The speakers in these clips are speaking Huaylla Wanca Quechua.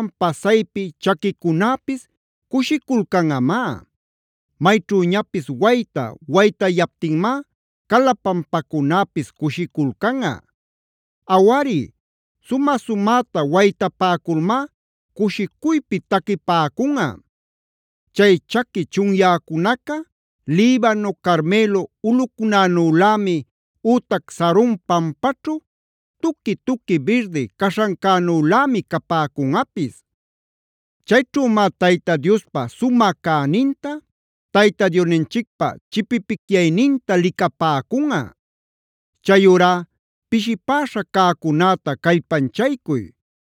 pasaypi chaquicunäpis cushiculcanꞌamá; mayćhüñapis wayta waytayaptinmá cala pampacunäpis cushiculcanꞌa. Awari, sumä-sumäta waytapäculmá cushicuypi taquipäcunꞌa. Chay chaqui chunyäcunaca Libano, Carmelo ulꞌucunänülämi ütac Saron pampaćhu tuqui-tuqui birdi cäśhancänülämi capäcunꞌapis. Chayćhümá Tayta Diospa sumä cäninta, Tayta Diosninchicpä chipipicyayninta licapäcunꞌa. Chayurá pishipäśha cäcunäta callpanchaycuy;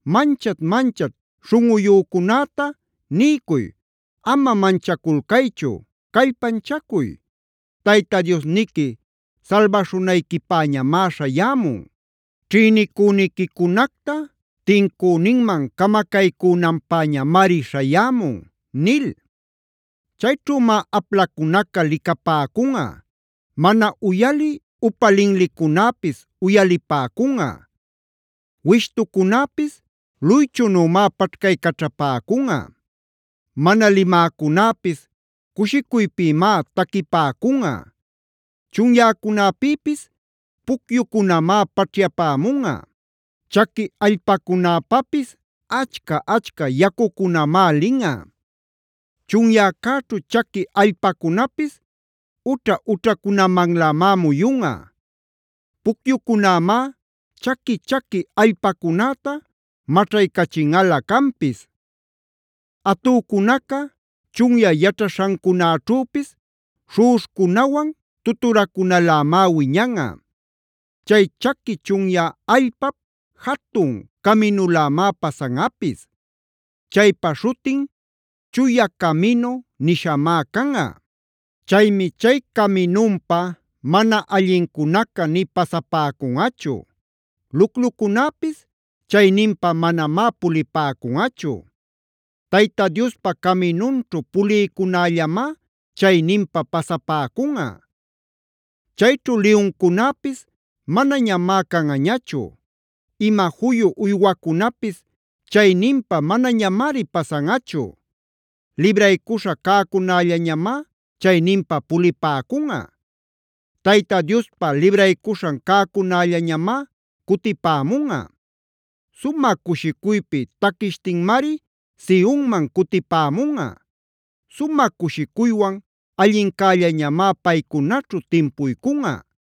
Manchat-manchat śhunꞌuyücunäta niycuy: “Ama manchaculcaychu; callpanchacuy. Tayta Diosniqui salbaśhunayquipäñamá śhayämun; ćhïnicüniquicunacta tincüninman camacaycünanpäñamari śhayämun” nil. Chayćhümá aplacunaca licapäcunꞌa; mana uyalï upa linlicunäpis uyalipäcunꞌa. Wishtucunäpis luychunümá paćhcaycaćhapäcunꞌa; mana limäcunäpis cushicuypïmá taquipäcunꞌa.b Chunyäcunäpïpis pucyucunamá paćhyapämunꞌa; chaqui allpacunäpapis achca-achca yacucunamá linꞌa. Chunyäćhu chaqui allpacunapis ućha-ućhacunamanlämá muyunꞌa. Pucyucunämá chaqui-chaqui allpacunäta maćhaycachinꞌalä canpis. Atücunaca chunyä yaćhaśhancunäćhüpis śhuꞌuśhcunawan tuturacunalämá wiñanꞌa. Chay chaqui chunyä allpap jatun caminulämá pasanꞌapis. Chaypa śhutin Chuya Caminu nishamá canꞌa. Chaymi chay caminunpa mana allincunaca nï pasapäcunꞌachu; luclucunäpis chayninpa manamá pulipäcunꞌachu.c Tayta Diospa caminunćhu pulïcunällamá chayninpa pasapäcunꞌa. Chayćhu liyuncunäpis manañamá canꞌañachu; ima juyu uywacunapis chayninpa manañamari pasanꞌachu. Libraycuśha cäcunällañamá chayninpa pulipäcunꞌa. Tayta Diospa libraycuśhan cäcunällañamá cutipämunꞌa; sumä cushicuypi taquishtinmari Sionman cutipämunꞌa. Sumä cushicuywan allincällañamá paycunaćhu timpuycunꞌa;